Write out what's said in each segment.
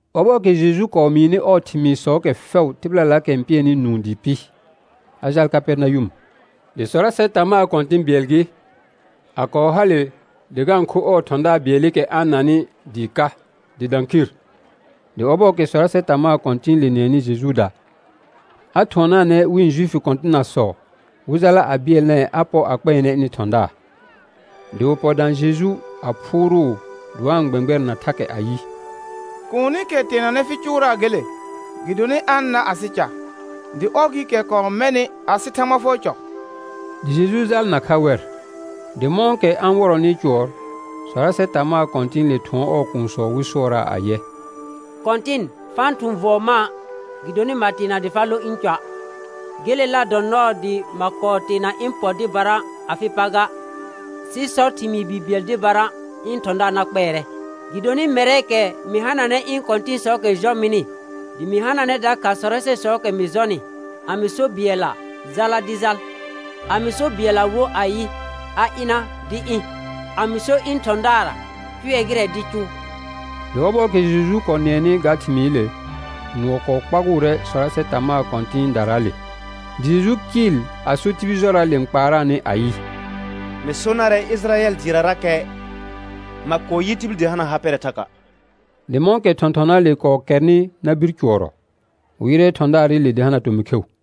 Ɔbɔɔkɛ Jeju kɔɔ mɩɩnɩ ɔɔ thɩmɩɩsɔɔkɛ fɛʋ tɩbɩlalaakɛ n pɩɛnɩ nũu dɩɩ pɩ, a jaal Kapɛrnayʋm. Dɩ sɔrasɛ tamaa kɔ̃tɩ̃ bɩɛl gɩ, a kɔɔ hale dɩ ga-n kho ɔɔ thɔ̃daar bɩɛlɩkɛ a-n nanɩ dɩɩ ka, dɩ dã khir. Dɩ ɔbɔɔkɛ sɔrasɛ tamaa kɔ̃tɩ̃ɩle nɩɛnɩ Jejuuda, a thʋɔnaanɛ wɩ̃ Juifi kɔ̃tɩnasɔ, wɩ jala a bɩɛlnɛɛ a pɔ a kpɛɛnɛ ɩnɩ thɔ̃daar. Dɩ wɩ pɔ dã Jeju a phʋʋrʋʋ dɩ wa-n gbɛ̃gbɛrɛna thakɛ ayɩ: Kuunikɛ teenanɛ fɩ cʋʋraa gele. Gɩdonɩ a-n nar asɩ ca, dɩ ɔr gɩɩkɛ kɔɔ mɛnɩ asɩ Thãgba fʋɔr cɔ. Dɩ Jeju jal nakha wɛr. Dɩ mɔ̃kɛ a-n wɔrɔnɩ cʋɔr, sɔrasɛ tamaa kɔ̃tɩ̃ɩle thʋɔn ɔɔ kuunsɔ wɩ sʋɔraa ayɛ: Kɔ̃tɩn, fa-n thʋ̃ vɔɔ mã', gɩdonɩ ma teena dɩ fa lõ ɩ̃ cɔa'. Gelela dɔ nɔɔ dɩ ma kɔɔ teena ɩ̃ pɔ dɩbara afɩ pa ga; sɩ sɔ thɩmɩɩ bi bɩɛl dɩbara, ɩ̃ thɔ̃daar na kpɛɛrɛ. Gɩdonɩ mɛrɛɛkɛ, mɩ hananɛ ɩ̃ kɔ̃tɩ̃sɔɔkɛ jɔ mɩnɩ, dɩ mɩ hananɛ dakha sɔrasɛsɔɔkɛ mɩ jɔnɩ. A mɩ so bɩɛlla: Jala, dɩ jal. A mɩ so bɩɛlla wo ayɩ, a ɩna, dɩ ɩ̃. A mɩ so ɩ̃ thɔ̃daarra: Cʋɛ gɩrɛ, dɩ cʋʋ. Dɩ ɔbɔɔkɛ Jeju kɔɔ nɩɛnɩ ga thɩmɩɩle, nʋɔ kɔɔ kpagʋʋrɛ sɔrasɛ tamaa kɔ̃tɩ̃ɩdaraale. Dɩ Jeju kɩɩl a so tibil jɔraale n kpaaraanɩ ayɩ: Mɩ so narɛ Ɩjɩrayɛl dɩɩrarakɛ ma kɔɔ yɩ tibil dɩ hana ha pɛrɛ thaka'. Dɩ mɔ̃kɛ thɔ̃thɔnaale kɔɔ kɛrnɩ na bir cʋɔrɔ, wɩ yɩrɛ thɔ̃daarɩle dɩ hana tomɩ kheu.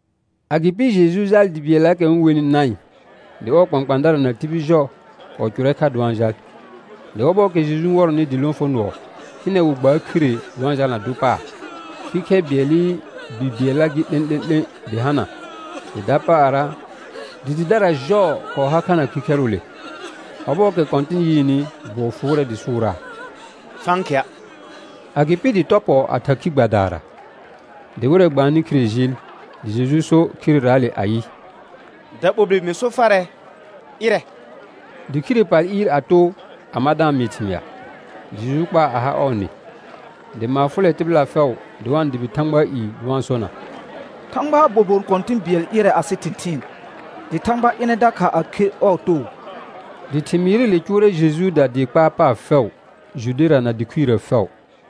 Agɩpɩ Jeju jaal dɩ bɩɛllaakɛ wɩ-n wenɩ Naɩn, dɩ ɔɔ kpãkpãadara na tibil jɔ kɔɔ cʋrrɛ kha dɩ wa-n jal. Dɩ ɔbɔɔkɛ Jeju n wɔrɔnɩ dɩ lõfonʋɔ, hɩnɛ wɩ gbaar khire dɩ wa-n jalna dʋ paar. Khikhɛr bɩɛlɩ bi bɩɛlla gɩ 'lẽ'lẽ'lẽ dɩ hana, dɩ dɩdara jɔɔ kɔɔ har kha na khikhɛrʋʋle. Ɔbɔɔkɛ Kɔ̃tɩn yɩɩnɩ, bʋɔ fʋʋrɛ dɩ sʋʋraa: Fa-n khɩa'. Agɩpɩ dɩ tɔ pɔ a thar khi gbadaara. Dɩ wɩrɛ gbaannɩ khire jɩɩl. Dɩ Jeju so khireraale ayɩ: Daɓolbir mɩ so farɛ, ɩrɛ. Dɩ khire pal ɩɩr a too a ma da-n mɩɩ thɩmɩa. Dɩ Jeju kpaa a ha ɔɔ nɩ. Dɩ maar fʋlɛ tɩbɩla fɛʋ, dɩ wa-n dʋbɩ Thãgbaa i dɩ wa-n sona: Thãgbaa bobon kɔ̃tɩ̃ bɩɛl ɩrɛ asɩ thɩ̃thɩɩn. Dɩ Thãgba ɩnɛ dakha a kher ɔɔ too. Dɩ thɩmɩɩrɩle cʋʋrɛ Jejuuda dɩɩ kpaar paar fɛʋ Judera na dɩ khuirə fɛʋ.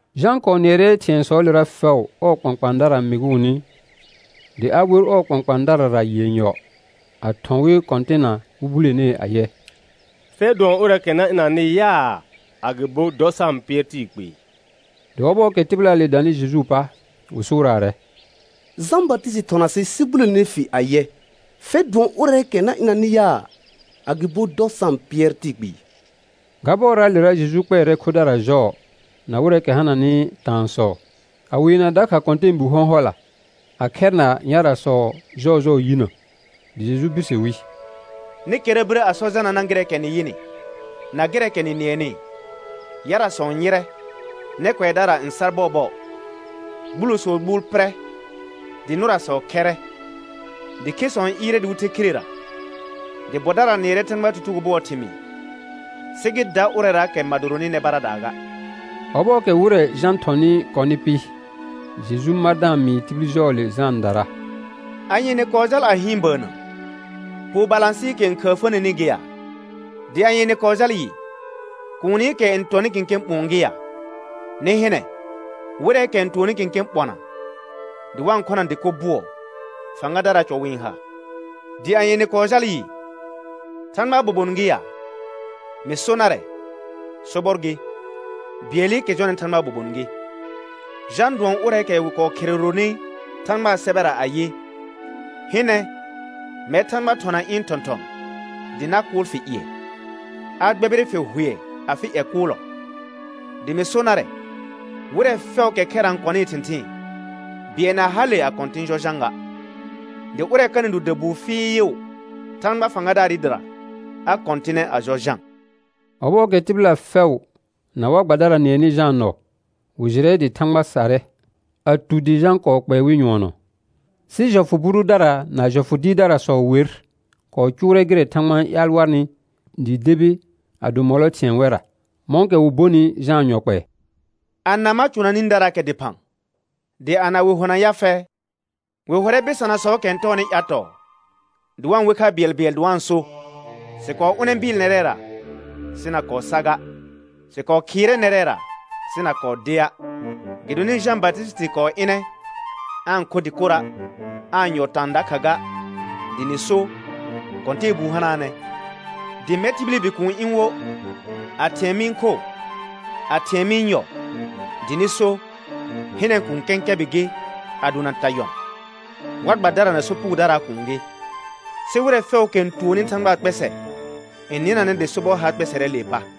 Jã kɔɔ nɩɛrɛ thɩ̃ɛsɔɔlera fɛʋ ɔɔ kpãkpãadara mɩgʋʋnɩ, dɩ a wer ɔɔ kpãkpãadarara yenyɔ, a thɔ̃ wɩ Kɔ̃tɩnna wɩ bulenee ayɛ: Fɛr dʋɔn ʋrɛɛkɛ na ɩnanɩ yaa, agɩbo dɔ sa-n pɩɛr tɩɩ kpɩɩ? Dɩ ɔbɔɔkɛ tɩbɩlaale danɩ Jejuu pa, wɩ sʋʋraarɛ: Jã Batɩsɩtɩ thɔna sɩ sɩ bulene fi ayɛ: Fɛr dʋɔn ʋrɛɛkɛ na ɩnanɩ yaa, agɩbo dɔ sa-n pɩɛr tɩɩ kpɩɩ? Ga bɔraalera Jeju kpɛɛrɛ khodara jɔɔ na wɩrɛɛkɛ hananɩ taansɔ, a weena dakha kɔ̃tɛɛbi hɔ̃hɔla, a khɛrna yarasɔ jɔɔjɔɔ yinə. Dɩ Jeju birse wi: Nɩ kɛra birə a sɔ Janana gɩrɛɛkɛ nɩ yɩnɩ, na gɩrɛɛkɛ nɩ nɩɛnɩ: Yarasɔ n yɩrɛ, nɛ kʋɛdara n sar bɔɔbɔɔ, gbulosɔɔ gbuul pɩrɛ, dɩ nʋrasɔ khɛrrɛ, dɩ khesɔ n ɩɩrɛ dɩ wɩ the khirera, dɩ bɔdara nɩɛrɛ Thãgbaa tutugo bʋɔɔ thɩmɩɩ. Sɩ gɩ da ʋrɛraakɛ ma doronɩ nɛ baradaa ga. Ɔbɔɔkɛ wɩrɛ Jã thɔnɩ kɔnɩ pɩ, Jeju mar da-n mɩɩ tibil jɔɔle Jãadara: Anye nɩ kɔɔ jal a hɩɩn bəənnə? Poo balãsɩɩkɛ n khəəfəneni gɩ ya? Dɩ anye nɩ kɔɔ jal yɩ? Kuunikɛ n tɔnɩ kẽkẽ ɓʋ̃ɔ gɩ ya? Nɩ hɩnɛ wɩrɛɛkɛ n tʋɔnnɩ kẽkẽ ɓɔna dɩ wa-n khona dɩko bʋɔ, fãgadaraa cɔ wɩ-n ha. Dɩ anye nɩ kɔɔ jal yɩ? Thãgbaa bobon gɩ ya? Mɩ so narɛ, sobɔr gɩ, bɩɛlɩkɛ jɔnɩ Thãgbaa bobon gɩ. Jã dʋɔn ʋrɛɛkɛ wɩ kɔɔ khereronɩ Thãgbaa sɛbɛra ayɩ: «Hɩnɛ, mɛr Thãgba thɔna ɩ̃ thɔ̃thɔ̃, dɩ na kʋʋl fɩ ƴɩɛ, a gbɛbɩrɩ fɩ hʋɛ afɩ ƴɛ kʋʋlɔ.» Dɩ mɩ so narɛ, wɩrɛ fɛʋraakɛ khɛra n kɔnɩɩ thɩ̃thɩɩn, bɩɛl na hale a kɔ̃tɩ̃ jɔ Jã ga. Dɩ ʋrɛ kanɩ do dabuu fɩɩʋ Thãgba fãgadaarɩ dɩra, a kɔ̃tɩnɛ a jɔ Jã. Ɔbɔɔkɛ tɩbɩla fɛʋ na war gbadara nɩɛnɩ Jãa nɔ, wɩ jɩrɛ dɩ Thãgba sarrɛ, a tu dɩ Jã kɔɔ kpɛɛ wɩ nyʋɔnɔ. Sɩ jɔfʋ bʋ dʋdara na jɔfʋ dɩɩrdarasɔ wer kɔɔ cʋʋrɛ gɩrɛ Thãgba n ƴaal warnɩ dɩɩ debi a do mɔlɔ thɩ̃ɛ wɛrra, mɔ̃kɛ wɩ bonɩ Jãa yɔ kpɛɛ. Ana ma cʋna nĩdaraakɛ dɩphã, dɩ ana wɩ hona ya fɛ? Wɩ hʋrɛ bɩsanasɔɔkɛ n tɔɔnɩ ƴatɔɔ, dɩ wa-n we kha bɩɛlbɩɛl dɩ wa-n so: Sɩ kɔɔ ʋnɛ bɩɩl nɛrɛra, sɩ na kɔɔ sa ga. Sɩ kɔɔ khɩɩrɛ nɛrɛra, sɩ na kɔɔ dea'. Gɩdonɩ Jã Batɩsɩtɩ kɔɔ ɩnɛ, aa-n kho dɩkora', aa-n yɔ taan dakha ga, dɩ nɩ so: Kɔ̃tɛɛbuu hanaanɛ. Dɩ mɛr tibili Bikuun ɩ̃ wo, a thɩ̃ɛ mɩ-n kho, a thɩ̃ɛ mɩ-n yɔ dɩ nɩ so: Hɩnɛ, kũu kɛ̃kɛbɩ gɩ a dona ta yɔn, war gbadara na sopugodaraa kuun gɩ. Sɩ wɩrɛ fɛʋʋkɛ n tuonni Thãgbaa kpɛsɛ n nɩnanɛ dɩ sobɔr har kpɛsɛrɛɛlee pa.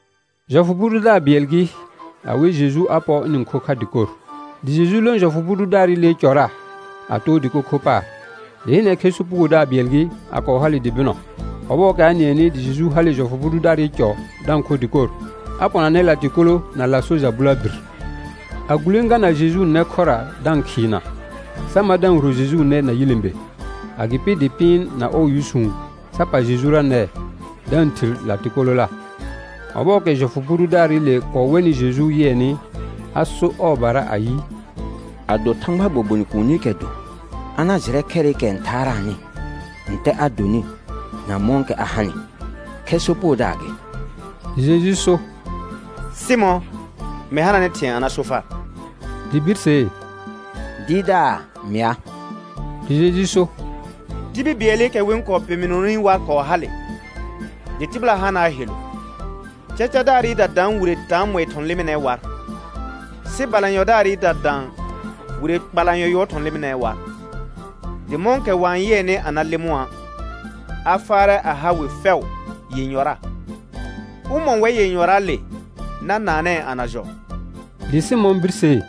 Jɔfʋ bʋ dʋdaar bɩɛl gɩ, a we Jeju a pɔ ɩnɩ-n kho kha dɩkor. Dɩ Jeju lõ jɔfʋ bʋ dʋdaarɩlee cɔra, a too dɩko kho paar. Dɩ hɩnɛ, khɛ sopugodaar bɩɛl gɩ, a kɔɔ hale dɩ bɩnɔ. Ɔbɔɔkɛ a nɩɛnɩ dɩ Jeju hale jɔfʋ bʋ dʋdaarɩ cɔ da-n kho dɩkor, a pɔnanɛ latɩkolo na laaso ja bʋlabir; a gulẽgana Jejuu nɛ khʋra da-n khɩɩna, sa ma da-n huro Jejuu nɛ na yilẽbe. Agɩpɩ dɩ pɩɩn na ɔɔ yʋsũ sa pal Jejura nɛɛ, da-n thir latɩkolola. Ɔbɔɔkɛ jɔfʋ bʋ dʋdaarɩle kɔɔ wɛnɩ Jeju yɩɛnɩ, a sor ɔɔbara ayɩ: Ado Thãgbaa bobon kuunikɛ do, a na jɩrɛ khɛrɩkɛ n thaaraanɩ, ntɛ a donɩ na mɔ̃kɛ a hanɩ: Khɛr sopugodaar gɩ. Dɩ Jeju so: Sɩmɔ̃, mɩ hananɛ thɩ̃ɛ a na so far. Dɩ birsee: Dɩɩrdaar, mɩa. Dɩ Jeju so: Tibil bɩɛlɩkɛ wɩ-n kɔɔ peminoni war kɔɔ hale, dɩ tɩbɩla hanaa helu. Cacadaarɩda daan wire taamɔɩ thɔ̃ lɩmɩnɛɛ war; sɩ balanyɔdaarɩda dã wire kpalanyɔ yʋɔr thɔ̃ lɩmɩnɛɛ war. Dɩ mɔ̃kɛ wa-n yɩɛnɩ a na lɩmʋa', a faarɛ a ha wɩ fɛʋ yenyɔra. Ʋmɔ̃ wɛr yenyɔraale na naanɛɛ a na jɔ? Dɩ Sɩmɔ̃ birsee: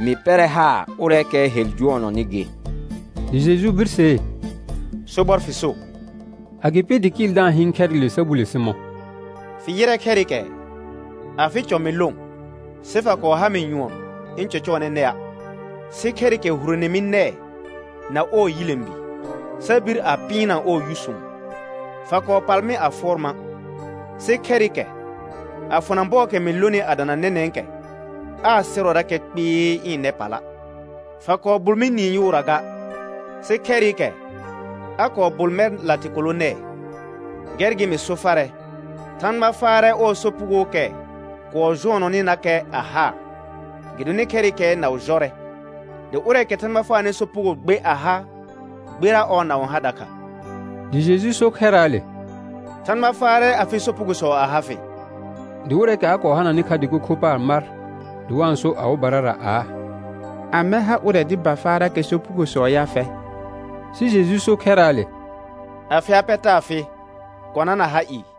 Mɩ pɛrɛ haar ʋrɛɛkɛɛ hel jʋɔnɔnɩ gɩ. Dɩ Jeju birsee: Sobɔr fɩ so. Agɩpɩ dɩ kɩɩl da-n hɩɩn khɛrɩle sa bule Sɩmɔ̃: Fɩ yɩrɛ khɛrɩkɛɛ? Afɩ cɔ mɩ lõ sɩ fa kɔɔ ha mɩ nyʋɔn ɩ̃ cɔcɔɔnɛ nɛa', sɩ khɛrɩkɛ hurone mi nɛɛ na ɔɔ yilẽbi sa bir a pɩɩnna ɔɔ yʋsũ. Fa kɔɔ pal mɩ a fʋɔr ma', sɩ khɛrɩkɛ a fʋna bɔɔkɛ mɩ lonɩ a dana nɛnɛ̃kɛ, aa sɩrɔrakɛ kpɩɩ ɩ̃ nɛ pala'. Fa kɔɔ bʋl mɩ niin yʋʋra ga, sɩ khɛrɩkɛ a kɔɔ bʋl mɛr latɩkolo nɛɛ. Gɛr gɩ mɩ so farɛ, Thãgba faarɛ ɔɔ sopugookɛ kɔɔ jʋɔnɔnɩnakɛ a haa, gɩdonɩ khɛrɩkɛɛ naʋ jɔrɛ; dɩ ʋrɛɛkɛ Thãgba faanɩ sopugo gbe a ha, gbera ɔɔ naʋ n ha dakha. Dɩ Jeju so khɛrraale: Thãgba faarɛ afɩ sopugosɔ a ha fɩ. Dɩ wɩrɛɛkɛ a kɔɔ hananɩ kha dɩko kho paar mar dɩ wa-n so awɩbarara aa: Amɛ ha ʋrɛ dɩ ba faarakɛ sopugosɔ ya fɛ? Sɩ Jeju so khɛrraale: Afɩ ha pɛ taa fɩ, kɔna na ha ɩɩ.